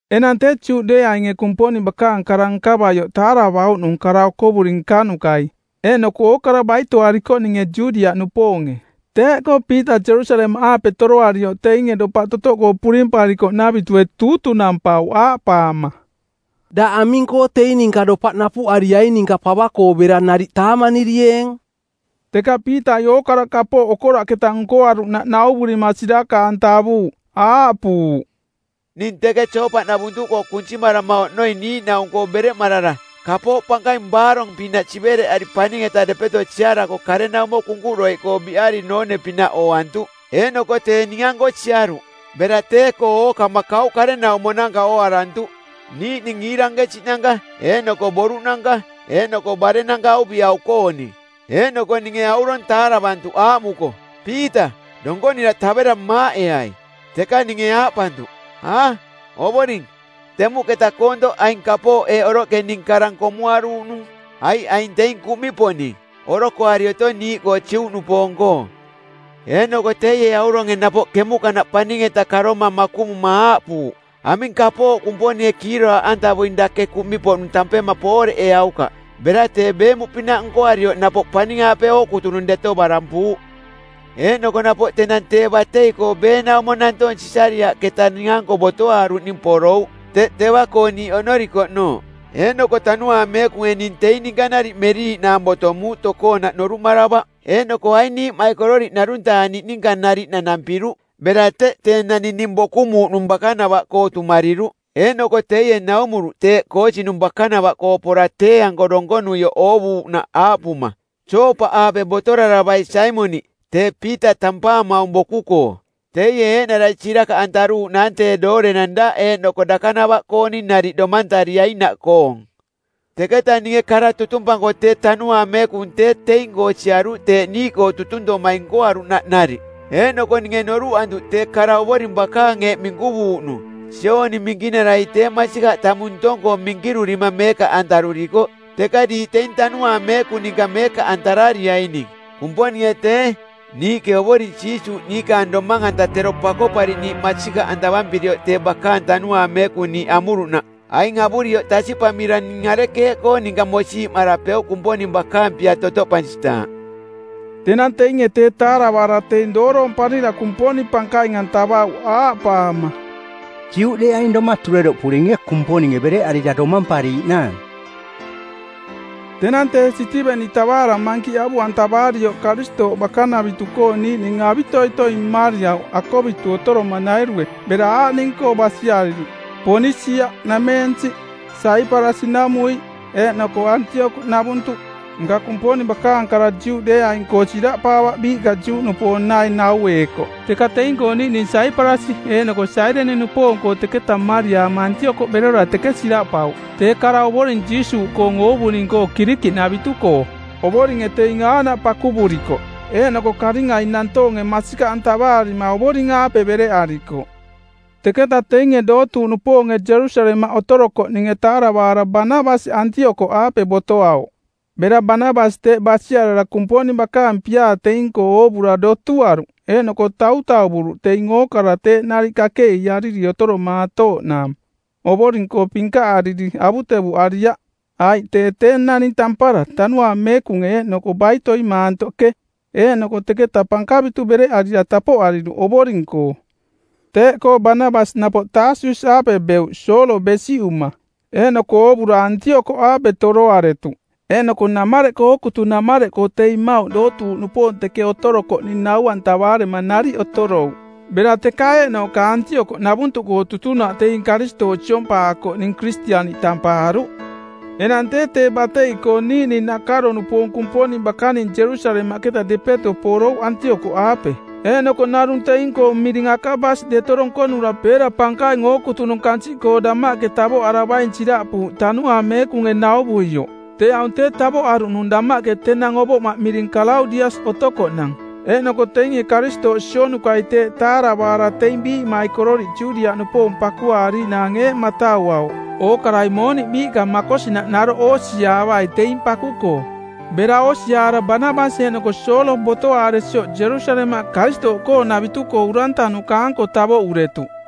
Enang tee Juꞌdeeainge Kumponing bakaang kara nkavaioꞌ taaravauꞌnung kara okovuri nkanukai eeꞌnoko ookara baitoarikoꞌninge Judiaꞌnupoonge. Teeꞌkoo Piita Jerusalemaꞌaape toroarioꞌ teinge dopaꞌ totoꞌkoo purimparikoꞌnavitue tuutunampauꞌ, aaꞌpaama, “Daꞌ aming-koo teing ninka dopaꞌ napuꞌariaing ninka pava-koo bera nariꞌ taamanirieeng?” Teka Piitai ookara kapooꞌ okoraꞌketa nkoaruꞌnaꞌ nauvurima sirakaꞌantavuuꞌ. Aaꞌpuuꞌ, “Ning teke Joopaꞌnavuntuꞌkoo kunsimarama oꞌnoi niiꞌnaung-koo bereꞌmarara kapooꞌ pankaing baarong-pinaꞌ sivereꞌari paning-eta depeto siarako karenaumo kunkuꞌdoiꞌkoo biꞌari noone-pinaꞌ ooantuꞌ. Eeꞌnoko tee ning-anko siaruꞌ. Bera tee-koo ookama kauꞌ karenaumonanka ooarantuꞌ, niiꞌning iirankesiꞌnanka, eeꞌnoko boruꞌnanka eeꞌnoko barennanka auviꞌau-kooning. Eeꞌnoko ninge aurong taaravantuꞌ aaꞌmuko, ‘Piita, donkonira tavera maaꞌeai.’ Teka ninge aaꞌpantuꞌ, ‘A, Ovoring, temuꞌketa koontoꞌ aing kapooꞌ eeꞌ oroꞌke ning karang komuaruuꞌnung, aiꞌ aing teing kuꞌmiꞌpoꞌning, orokoari otong niiꞌkoo Juꞌnupoong-koo.’ Eeꞌnoko teie auronge napoꞌ kemuꞌkanaꞌ paning-eta karoma makuꞌmuma aaꞌpuuꞌ, ‘Aming kapooꞌ Kumponinge kiiroraaꞌantavuing dake kuꞌmiꞌpoꞌnung tampema pooreꞌeaukaꞌ.’ Bera tee beemuꞌpinaꞌ nkoarioꞌ napoꞌ paning-aape ookutunung deto barampuuꞌ. Eeꞌnoko napoꞌ tenang tee batei-koo beenaumo nantoong Sisariaꞌketa ning-anko botoaaruꞌning porouꞌ teꞌ teva-koo niiꞌ oꞌnorikoꞌnooꞌ. Eeꞌnoko Tanuaang Meekunge ning teing ninka nariꞌ meriiꞌnaang botomuuꞌ tokoonaꞌ noruꞌmaravaꞌ. Eeꞌnoko aing niiꞌmaikororiꞌ ˜narung-taa niꞌninka nariꞌ nanampiruꞌ bera teꞌ tee naning ning bokumuuꞌnung bakanava-koo tumariruꞌ. Eeꞌnoko teie naumuruꞌ teeꞌ koosinung bakanava-koo pora tee-anko donkonuioꞌ oovuuꞌnaꞌ aaꞌpuma, ‘Joopaꞌaape botoraravai Saimoniꞌ, tee Piita tampaamaung boku-koo. Teie eeꞌnarai sirakaꞌantaruuꞌnaang tee doorenang daꞌ eeꞌnoko dakanava-kooning nariꞌ domantariainaꞌkoong.’ “Teketa ninge kara tutumpanko tee Tanuaang Meekung tee teing-koo siaruꞌ teeꞌ niiꞌkoo tutuntomai nkoaruꞌnaꞌ nariꞌ. Eeꞌnoko ninge norunoruꞌantuꞌ tee kara Ovoring bakaang eeꞌ minkuvuuꞌnung, ‘Jooni Minkinarai tee masikaꞌ tamung ntong-koo minkirurima meekaꞌantarurikoꞌ, teka diiꞌ teing Tanuaang Meekung ninka meekaꞌantarariaining.’ Kumponinge tee, niiꞌke Ovoring Jiisuuꞌ niikaang domang-anta tero Pakoꞌpariꞌniiꞌ masikaꞌantavampirioꞌ tee bakaang Tanuaang Meekung niiꞌ amuruꞌnaꞌ aing avurioꞌ tasiꞌpamira ning arekeeꞌkoo ninka mosiiꞌmarapeuꞌ Kumponing bakaang pia totoꞌpansitaaꞌ?” Tenang teinge tee taaravaara teing dooroomparira Kumponing pankaing-antavauꞌ aaꞌpaama, “Juꞌdeeaing doma tureroꞌpuringe Kumponinge bereꞌarira domampariiꞌnaang.” Tenang tee Sitiveni tavaara mankiꞌ avuꞌantavaarioꞌ Karistooꞌ bakanavitu-koo niiꞌning avitoitoi mmariauꞌ akovitu otoromanairue bera aaꞌning-koo basiariruꞌ Ponisia-nameensiꞌ, Saiparasi-namuiꞌ eeꞌnoko Antiokoꞌnavuntuꞌ. Nka Kumponing bakaang kara Juꞌdeeaing-koo siraꞌpaavaꞌ biiꞌka Juꞌnupoong naing naueekoꞌ. Teka teing-koo niiꞌning Saiparasi eeꞌnoko Sairini-nupoong-koo teketa mmariaama Antiokoꞌ berora teke siraꞌpauꞌ tee kara Ovoring Jiisuuꞌkoong oovuning-koo Kirikiꞌnavitu-koo. Ovoringe teing aaꞌnaꞌ pakuvurikoꞌ. Eeꞌnoko karingai nantoonge masikaꞌantavaarima Ovoring-aape bereꞌarikoꞌ. Teketa teinge dootuuꞌnupoonge Jerusalemaꞌ otorokoꞌninge taaravaara Banabasi Antiokoꞌaape botoauꞌ. Bera Banabasi teꞌ basiarara Kumponing bakaang piaa teing-koo oovura dotuaruꞌ, eeꞌnoko tautauvuruꞌ teing ookara teeꞌ nariꞌ kakeꞌiiariri otoromaatooꞌnaang, Ovoring-koo pinkaꞌariri, avutevuꞌariaꞌ. Aiꞌ tee tee naning tampara, Tanuaang Meekunge eeꞌnoko baitoi maantoꞌke. Eeꞌnoko teketa pankavitu bereꞌarira tapoꞌariruꞌ Ovoring-koo. Teeꞌkoo Banabasi napoꞌ Taasus-aape beuꞌ Soolo besiꞌuma. Eeꞌnoko oovura Antiokoꞌaape toroaretuꞌ. Eeꞌnoko namareꞌkoo ookutunamareꞌkoo teing mmauꞌ dootuuꞌnupoong teke otorokoꞌning nau-antavaarema nariꞌ otorouꞌ. Bera teka eeꞌnooꞌka Antiokoꞌnavuntuꞌkoo tutunaꞌ teing Karistooꞌ siompaakoꞌning Kiristianiꞌ tampaaruꞌ. Enang tee tee batei-koo niiꞌning nakaro-nupoong Kumponing bakaning Jerusalemaꞌketa depeto porouꞌ Antiokoꞌaape. Eeꞌnoko narung teing-koong miring Akabas deto donkonura peera pankaing ookutunung kansiꞌkoo damaꞌke tavoꞌaravaing siraꞌpuuꞌ Tanuaang Meekunge nauvuioꞌ. Tee aung tee tavoꞌaruꞌnung damaꞌke tenang ovoꞌmaꞌ miring Kalaudias otokoꞌnang. Eeꞌnoko teinge Karistooꞌ sionukai teeꞌ taaravaara teing biiꞌmaikororiꞌ Judiaꞌnupoong pakuaariiꞌnaang eeꞌ matauauꞌ: ookarai mooniꞌ biiꞌka makosinaꞌ naroꞌ oosiaavai teing paku-koo. Bera oosiaara Banabasi eeꞌnoko Soolo botoaaresioꞌ Jerusalemaꞌ Karistooꞌkoonavitu-koo urantanuka-anko tavoꞌuretuꞌ.